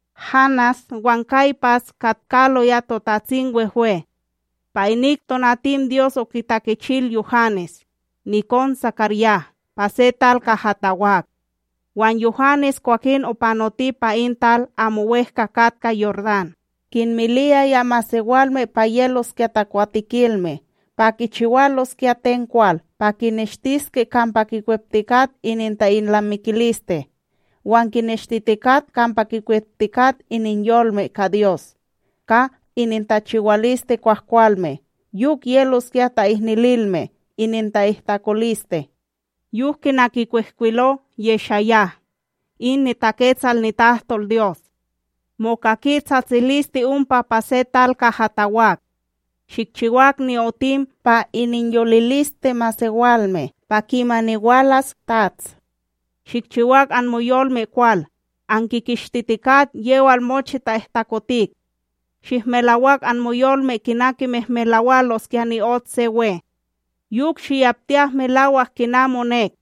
Hanás wan Kaypas katkaloya TotatsimWehwe. Pa inik tonatim Dyos okitakichil Yuhanes, nikon SakarYah pa se tal kaha tawak; wan Yuhanes kwakin opanoti pa in tal amo wEhka katka Yordán, kinmiliyaya masewalme pa yeloskya takwatekilme, pa kichiwaloskya ten kwal pa kineshtiske kampa kikweptikat ininta’ilnamikiliste wan kineshtitikat kampa kikweptikat ininyolme ka Dyos ka inintachiwaliste kwahkwalme, yok yeloskya ta'ihnililme ininta'ihtakoliste. Yok kina kikwihkwilo YeshaYah in niTaketsal nitahtolDyos: Mokaki tsatsiliste ompa pa se tal kaha tawak: “Shikchiwak ni'otim pa ininyoliliste masewalme pa kimani walas TATS; Shikchiwak anmoyolme kwal, ankikishtitikat yewal mochi ta'ihtakotik. Shihmelawak anmoyolme kina kimehmelawaloskya ni'ot se we. Yok shiyaptiyak melawak kina monek.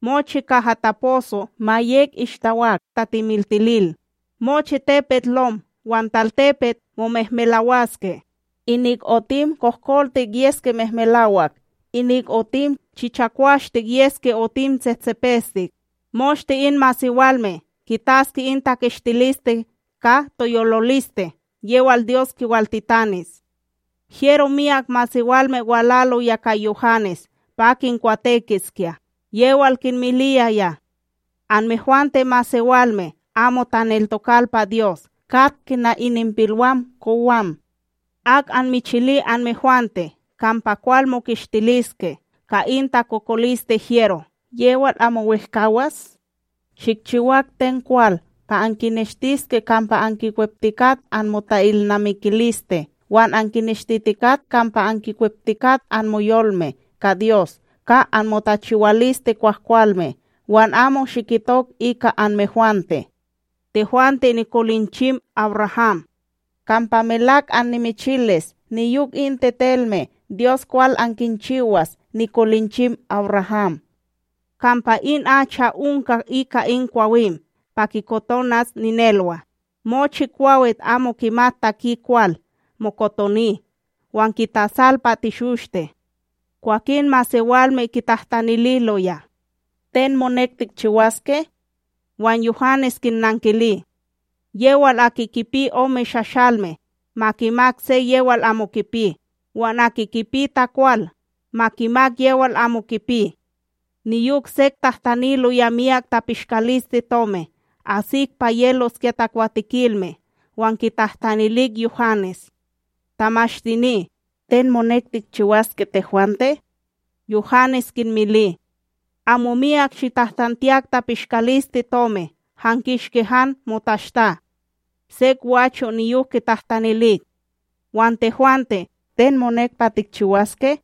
Mochi kaha taposo ma yek ishtawak tatemiltilil, mochi tepetLom wan talTepet momehmelawaske, inik otim kohkoltik yeske mehmelawak, inik otim chichakwashtik yeske otim tsehtsepestik; moshte in masewalme kitaske in takishtiliste ka toyololiste yewal Dyos kiwaltitanis.” Hyero myak masewalme walaloya ka Yuhanes pa kinkwatekiskya, yewal kinmiliyaya: ―Anmehwante masewalme amo taneltokal pa Dyos kat kina ininpilwam kowan! Ak anmichili anmehwante kampa kwal mokishtiliske ka in takokoliste hyero yewal amo wehkawas? Shikchiwak ten kwal pa ankineshtiske kampa ankikweptikat anmota’ilnamikiliste wan ankineshtitikat kampa ankikweptikat anmoyolme ka Dyos ka anmotachiwaliste kwahkwalme wan amo shikitok ika anmehwante: “Tehwante nikolinchim AbRaham”; kampa melak annimichilis niyok in tetelme Dyos kwal ankinchiwas nikolinchim AbRaham. Kampa in acha onka ika in kwawim pa kikotonas ninelwa, mochi kwawit amo kimat taki kwal mokotoni wan kitasal pa teshoshte. Kwakin masewalme kitahtanililoya: ―Ten monek tikchiwaske? Wan Yuhanes kinnankili: ―Yewal aki kipi ome shashalme, ma kimak se yewal amo kipi; wan aki kipi takwal, ma kimak yewal amo kipi. Niyok sek tahtaniloya miyak tapishkalisteTomib asik pa yeloskya takwatikilme wan kitahtanilik Yuhanes: ―Tamashtini, ten monek tikchiwaske tehwante? Yuhanes kinmili: ―Amo miyak shitahtantiyak tapishkalisteTomi han kishki han motashta. Sek gwacho' niyok kitahtanilik: ―Wan tehwante, ten monek pa tikchiwaske?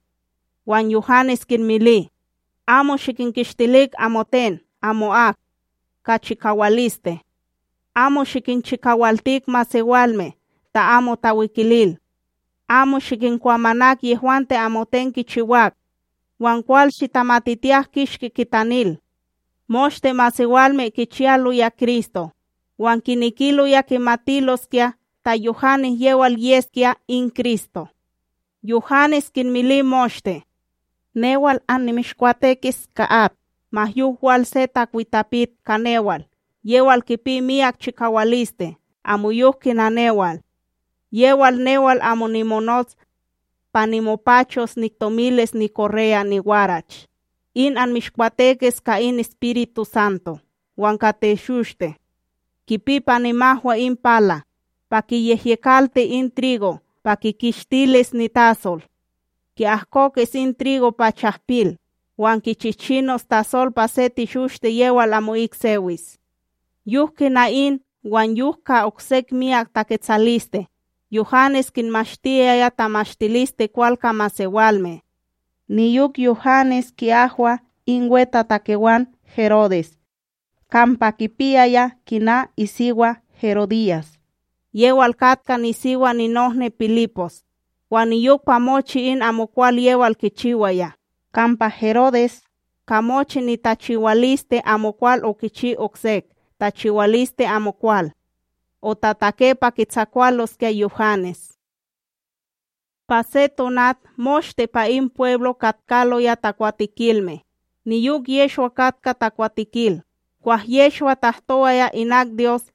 Wan Yuhanes kinmili: ―Amo shikinkishtilik amoten amo'ak ka chikawaliste, amo shikinchikawaltik masewalme ta amo tawikilil; amo shikinkwamanak yehwante amoten kichiwak wan kwal shitamatitiyak kishki kitanil. Moshte masewalme kichiyaloya Kristo, wan kinekiloya kimatiloskya ta Yuhanes yewal yeskya in Kristo; Yuhanes kinmili moshte: ―Newal, annimishkwatekis ka at; ma yok wal se takwitapit ka newal yewal kipi miyak chikawaliste amoyok kina newal, yewal newal amo nimonots pa nimopachos niktomilis nikorreya niwarach, in anmishkwatekis ka in EspirituSanto wan ka teshoshte. Kipi pa nimahwa in pala, pa kiyehyekalti in trigo pa kikishtilis nitasol. Ki'ahkokis in trigo pa chahpil, wan kichichinos tasol pa se teshoshte yewal amo'ik sewis. Yok kina in wan yok ka oksek myak taketsaliste, Yuhanes kinmashtiyaya tamashtilisteKwal ka masewalme. Niyok Yuhanes ki'ahwa in wetatakewan Herodes kampa kipiyaya kina isiwa Herodyas, yewal katka nisiwa ninohni Pilipos, wan niyok pa mochi in amokwal yewal kichiwaya; kampa Herodes, ka mochi nitachiwaliste amokwal, okichi oksek tachiwaliste amokwal: otatake pa kitsakwaloskya Yuhanes. Pa se tonat moshte pa in pweblo katkaloya takwatekilme, niyok Yehshwa katka takwatekil; kwah Yehshwa tahtowaya inak Dyos,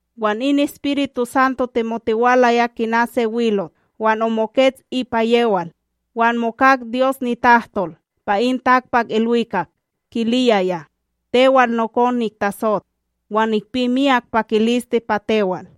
wan in EspirituSanto temotiwalaya kina se wilot wan omokets ipa yewal, wan mokak Dyos nitahtol pa in takpakIlwikak kiliyaya: ―Tewal nokon niktasot; wan nikpi miyak pakiliste pa tewal.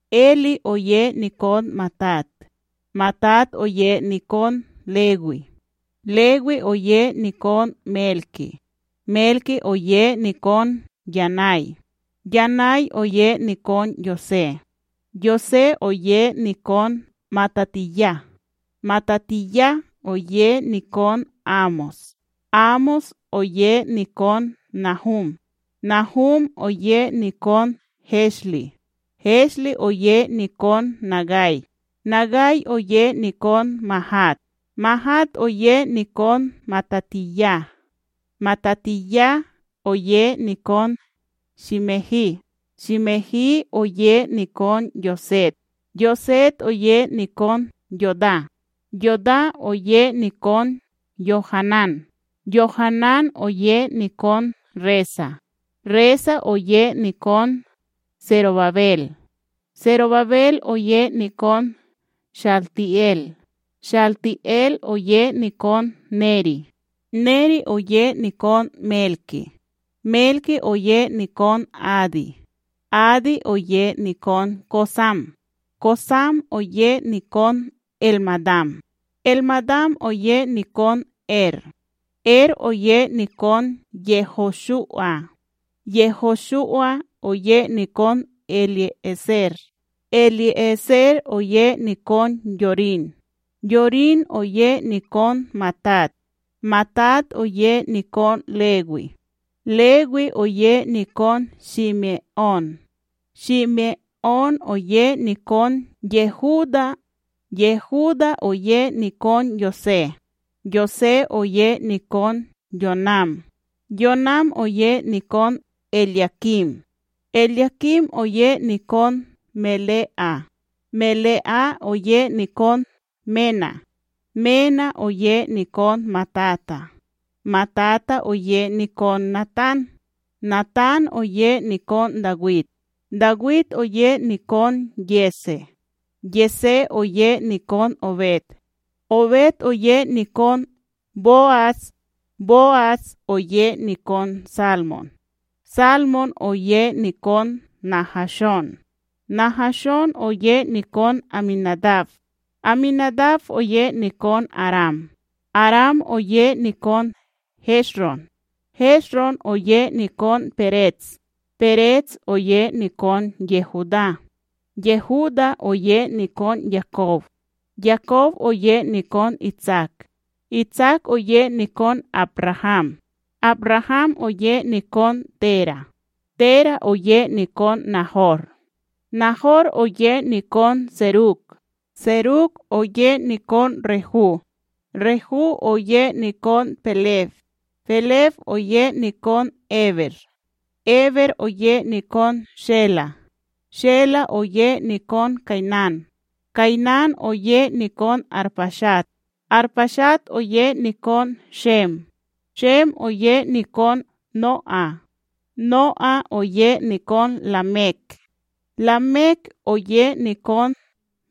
Elí oye nikon Matat, Matat oye nikon Lewí, Lewí oye nikon Melki, Melki oye nikon Yanay, Yanay oye nikon Yosé, Yosé oye nikon MatatíYah, MatatíYah oye nikon Amós, Amós oye nikon Nahúm, Nahúm oye nikon Heslí, Heslí oye nikon Nagay, Nagay oye nikon Máhat, Máhat oye nikon MatatíYah, MatatíYah oye nikon Shímehi, Shímehi oye nikon Yosek, Yosek oye nikon Yodá, Yodá oye nikon YoHanan, YoHanan oye nikon Resa, Resa oye nikon Serobabel, Serobabel oye nikon ShaltiEl, ShaltiEl oye nikon Neri, Neri oye nikon Melki, Melki oye nikon Adí, Adí oye nikon Kosam, Kosam oye nikon ElMadam, ElMadam oye nikon Er, Er oye nikon YehoShu'a, YehoShu'a oye nikon EliÉser, EliÉser oye nikon Yorin, Yorin oye nikon Matat, Matat oye nikon Lewí, Lewí oye nikon Shime'ón, Shime'ón oye nikon Yehudá, Yehudá oye nikon Yosé, Yosé oye nikon Yonam, Yonam oye nikon ElYakim, ElYakim oye nikon Mele'á, Mele'á oye nikon Mená, Mená oye nikon Matata, Matata oye nikon Natán, Natán oye nikon Dawid, Dawid oye nikon Yesé, Yesé oye nikon Obed, Obed oye nikon Bo'as, Bo'as oye nikon Salmón, Salmón oye nikon Nahashón, Nahashón oye nikon AmiNadab, AmiNadab oye nikon Aram, Aram oye nikon Hesron, Hesron oye nikon Perets, Perets oye nikon Yehudá, Yehudá oye nikon Yakob, Yakob oye nikon Itsak, Itsak oye nikon AbRaham, AbRaham oye nikon Téra, Téra oye nikon Nahor, Nahor oye nikon Serug, Serug oye nikon Rehu, Rehu oye nikon Peleg, Peleg oye nikon Éber, Éber oye nikon Shelá, Shelá oye nikon Kaynán, Kaynán oye nikon Arpashad, Arpashad oye nikon Shem, Shem oye nikon No'á, No'á oye nikon Lamek, Lamek oye nikon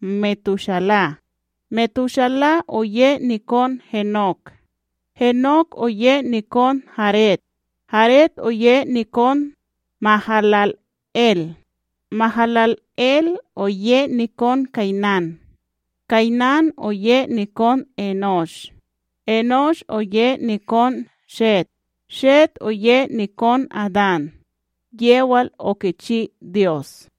Metushala, Metushala oye nikon Henok, Henok oye nikon Yared, Yared oye nikon MahalalEl, MahalalEl oye nikon Kaynán, Kaynán oye nikon Enósh, Enósh oye nikon Shet, Shet oye nikon Adán, yewal okichi Dyos.